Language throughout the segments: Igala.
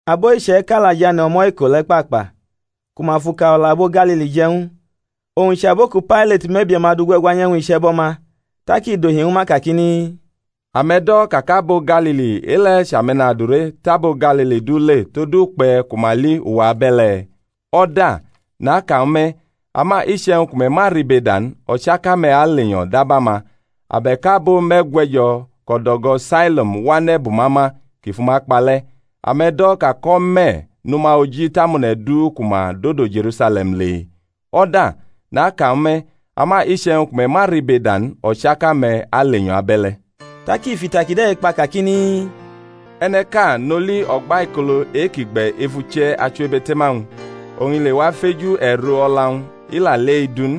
Abo iche̩ka la jʼane̩ o̩mo̩ iko le̩ kpakpa ku ma fʼuka o̩la abo Galili je̩ ñw u, owñ chʼabo ku Pailat mʼe̩bie̩-ma du gwe̩gwanyʼe̩wñ iche̩bo̩-ma. Tak i dohi ñwu ma kakini, Ame̩ do̩ ka kʼabo Galili e-le̩ chʼame̩nadure tʼabo Galili du le, tod ukpe̩ ku ma li uwa abe̩le̩? O̩da! naka ñwu me̩; ama iche̩wñ ku me̩ ma ribeda n, o̩chaka-me̩ alenyo̩ dab ama. Abe̩k abo me̩gwe̩jo̩ kʼo̩do̩go̩ Sailoam wane̩ bʼuma ma kʼi fʼuma kpa le̩, ame̩ do̩ ka kʼo̩me̩ nʼuma oji tʼamone̩ du ku ma dodo Je̩rusale̩m le? O̩da! naka ñwu me̩; ama iche̩wñ ku me̩ ma ribeda n, o̩chaka-me̩ alenyo̩ abe̩le̩. Tak i fʼita kide̩ kpa kakini, E̩ne̩ ʼka nʼoli o̩gbaikolo e-kʼi gbe̩ ef uche̩ achiwebe̩te̩ma-wñ; oñ i lewa feju e̩ro o̩la-wñ, i la li e-du n.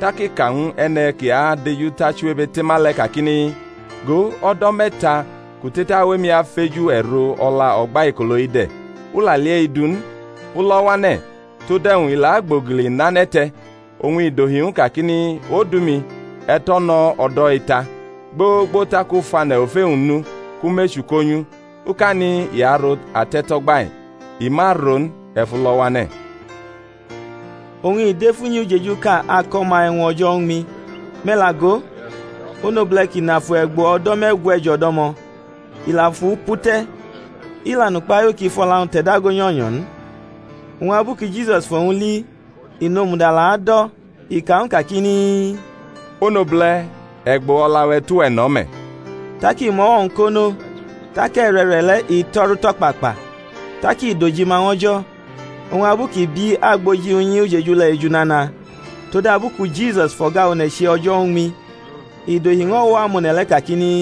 Tak i ka ñw e̩ne̩ ki adejutʼachiwebe̩te̩ma le̩ kakini, Go, o̩do̩ me̩ta kʼu tetawʼemi afeju e̩ro o̩la o̩gbaikolo-i de̩, u la li e-du n. Fʼu lo̩ wʼane̩; tod e̩wñ i la agbogili nʼane̩ te̩? Oñ i dohi ñw u kakini, Odu-mi, e̩ tʼo̩ no̩ o̩do̩-i ta, gbogbo tak u fʼane̩ ofe-wñ nu, kʼu mʼechu ko nyʼu. Ukani i aro ate̩to̩gba-i; i ma ro n, e̩ fʼu lo̩ wʼane̩. Oñ i dʼef unyi ujejuʼka ako̩ ma e̩wñ o̩jo̩ uñmi. Me̩ la go, onobule̩ ki nʼafu e̩gbo̩ o̩do̩ me̩gwe̩jo̩ do̩mo̩; i la fʼu pu te̩; i la nʼukpahiu kʼi fʼo̩la-wñ te̩ dago nyo̩nyo̩ n. Oñ abu ku Jisus fʼowñ li i nomudala adʼo̩, i ka ñw u kakini, Onobule̩, e̩gbo o̩la-we̩ tʼuwe̩ no̩ me̩. Tak i mʼo̩wo̩-wñ ko nʼo, tak e̩re̩re̩le̩ i to̩ru tʼo̩kpakpa, tak i dojima ñw O̩jo̩. Oñ abu ki bi agboji unyi ujeju le̩ eju nana todabu ku Jisus fʼo̩ga one̩ che o̩jo̩ uñmi, i dohi ñw o̩wo̩ amone̩ le̩ kakini,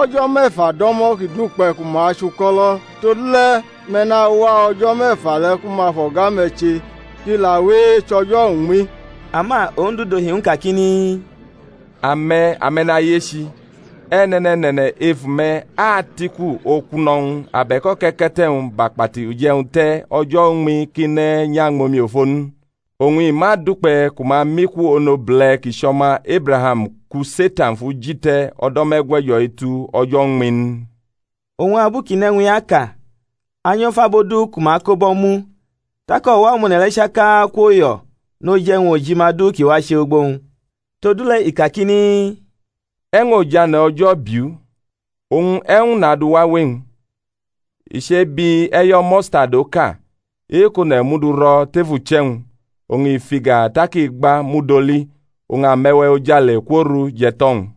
O̩jo̩ me̩fa do̩mo̩ ki dukpe̩ ku ma chʼuko̩lo̩: todule̩ me̩ nawa o̩jo̩ me̩fa le̩ ku ma fʼo̩ga-me̩ che, kʼi la we echʼo̩jo̩ uñmi. Ama Ondu dohi ñw u kakini, Ame̩ ame̩nayechi! e̩ne̩ne̩ne̩ne̩ ef ume̩ atʼiku okuno̩-wñ abe̩k oke̩ke̩te̩-wñ bʼakpati uje̩wñ te̩ o̩jo̩ uñmi kʼi ne̩ nyʼañmʼomiofo n? Oñ i ma dukpe̩ ku ma mʼiku onobule̩ kʼi chʼo̩ma Ebraham ku Setan fʼu ji te̩ o̩do̩ me̩gwe̩jo̩-i tu o̩jo̩ uñmi n? Oñ abu kʼi nʼe̩wñ-i aka anyo̩ fʼabo du ku ma ko bʼo̩ mu. Tak o̩wo̩ amone̩ le̩ chaka kwoyo̩ noj e̩wñ ojima du ki wache ugbo-wñ. Todule̩ i kakini, E̩wñ ojane̩ O̩jo̩ biʼu? Oñ e̩wñ nadu wawe-wñ? I chebi e̩yo̩ mustadi oka, e-kʼone̩ mʼu duro̩ tef uche̩-wñ; oñ i fʼiga tak i gba mud oli, oñ ame̩we̩ ojale kworu jʼe̩to̩-wñ.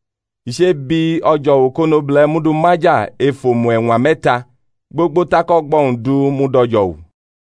I chebi o̩jo̩wu kʼonobule̩ mʼu du maja ef omu e̩ñwa me̩ta, gbogbo tak o̩gbo̩-wñ du mud o̩jo̩wu.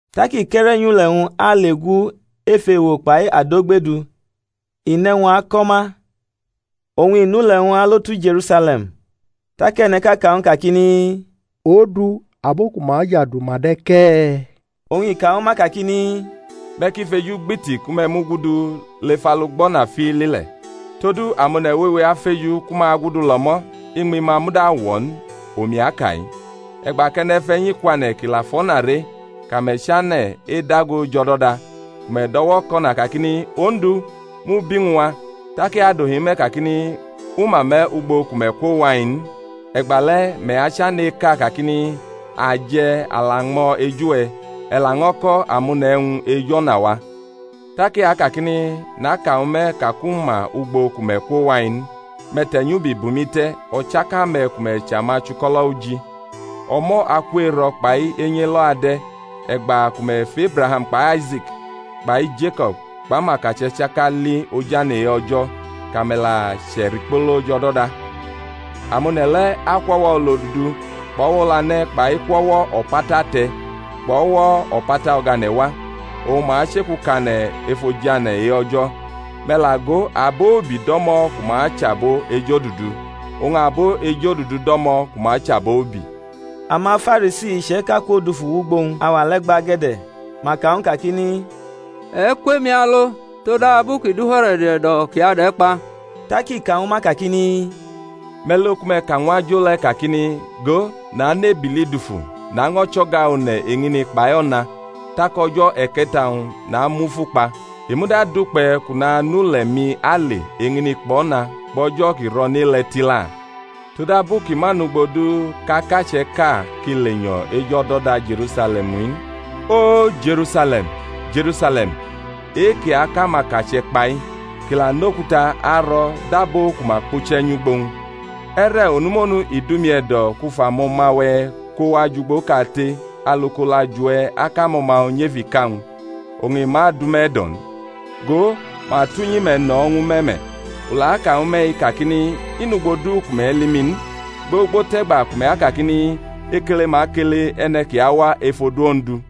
Tak i kʼe̩re̩ nyʼule̩-wñ ale gu ef ewo kpai adogbe du, i nʼe̩wñ ako̩ ma, oñ i nʼule̩-wñ alo tu Je̩rusale̩m. Tak e̩ne̩ʼka ka ñw u kakini, Ondu, abo ku ma ajadu ma de̩ ke̩e̩? Oñ i kañwu ma kakini, Me̩ ki fejugbiti ku me̩ mugudu lef alugbo̩na fiili le̩; todu amone̩ wewe afeju ku ma agudu lʼo̩mo̩, iñmi-ma muda awo̩ n, omi aka-i. E̩gba kʼe̩ne̩fe̩nyi kwane̩ kʼi la fʼo̩na re, kʼame̩ chane̩ edago jʼo̩do̩da, ku me̩ do̩wo̩kʼo̩na, kakini, Ondu, mʼu bi ñw a; tak i adohi ñwu me̩ kakini, U ma me̩ ugbo ku me̩ kwowa-i n; e̩gbale̩ me̩ achane̩ eka kakini, A je̩, a la ñmo̩ eju-we̩, e̩ laño̩ ko̩ amone̩ e̩wñ ej o̩na-wa; tak I akakini, Naka ñwu me̩ ka kʼu ma ugbo ku me̩ kwo wa-i n; me̩ te̩ nyʼubi bʼumi te̩ o̩chaka me̩ ku me̩ chʼamachuko̩lo̩ uji. O̩mo̩ aku ero̩ kpai enyi elo ade̩, e̩gba ku me̩ fʼEbraham kpai Aise̩k kpai Jeko̩b kpʼamakache̩ chaka li ojane̩ e-O̩jo̩, kʼame̩ la che̩rikpolo jʼo̩do̩da. Amone̩ le̩ akwʼo̩wo̩ olodudu kpʼo̩wo̩ olane̩ kpai kwʼo̩wo̩ o̩pata ate̩ kpʼo̩wo̩ o̩pata o̩gane̩ wa, oñ ma achekukane̩ ef ojane̩ e-O̩jo̩. Me̩ la go, abo ubi do̩mo̩ ku ma achʼabo ejodudu, oñ abo ejodudu do̩mo̩ ku ma achʼabo ubi. AmaFarisi iche̩ka kwodufu wʼugbo owñ auwa le̩ gbage̩de̩, ma ka ñw u kakini, E̩ kwʼemi alo: todabu ki du He̩ro̩d e̩do̩ kʼi adʼe̩ kpa. Tak i ka ñwu ma kakini, Me̩ lo ku me̩ ka ñw ajo le̩ kakini, Go, nanʼebili dufu, naño̩ chʼo̩ga one̩ eñini kpai ona, tak o̩jo̩ e̩ke̩ta-wñ namufu kpa. I muda dukpe̩ kʼu nanule̩-mi ale eñini kpʼo̩na kpʼo̩jo̩ ki ro̩nʼe-le̩ tila; todabu ki ma nʼugbo du kʼakache̩ʼka ki lenyo̩ ej o̩do̩da Je̩rusale̩m in. O, Je̩rusale̩m, Je̩rusale̩m, e-kʼi akʼamakache̩ kpa-i, kʼi la nʼokuta aro̩ dʼabo ku ma kpuche̩ nyʼugbo-wñ! E̩re̩ onumonu i dʼumi e̩do̩ kʼu fʼamo̩ma-we̩ ko wa jʼugbo kate alu kʼolajuwe̩ akʼamo̩ma-wñ nyʼef ika-wñ, oñ i ma dʼume̩ e̩do̩ n! Go, ma tʼunyi-me̩ no̩ ñwu me̩ me̩; u la aka ñwu me̩-i kakini, I nʼugbo du ku me̩ li mi n, gbogbo tʼe̩gba ku me̩ akakini, Ekele ma kele E̩ne̩ kʼi awa ef odu Ondu.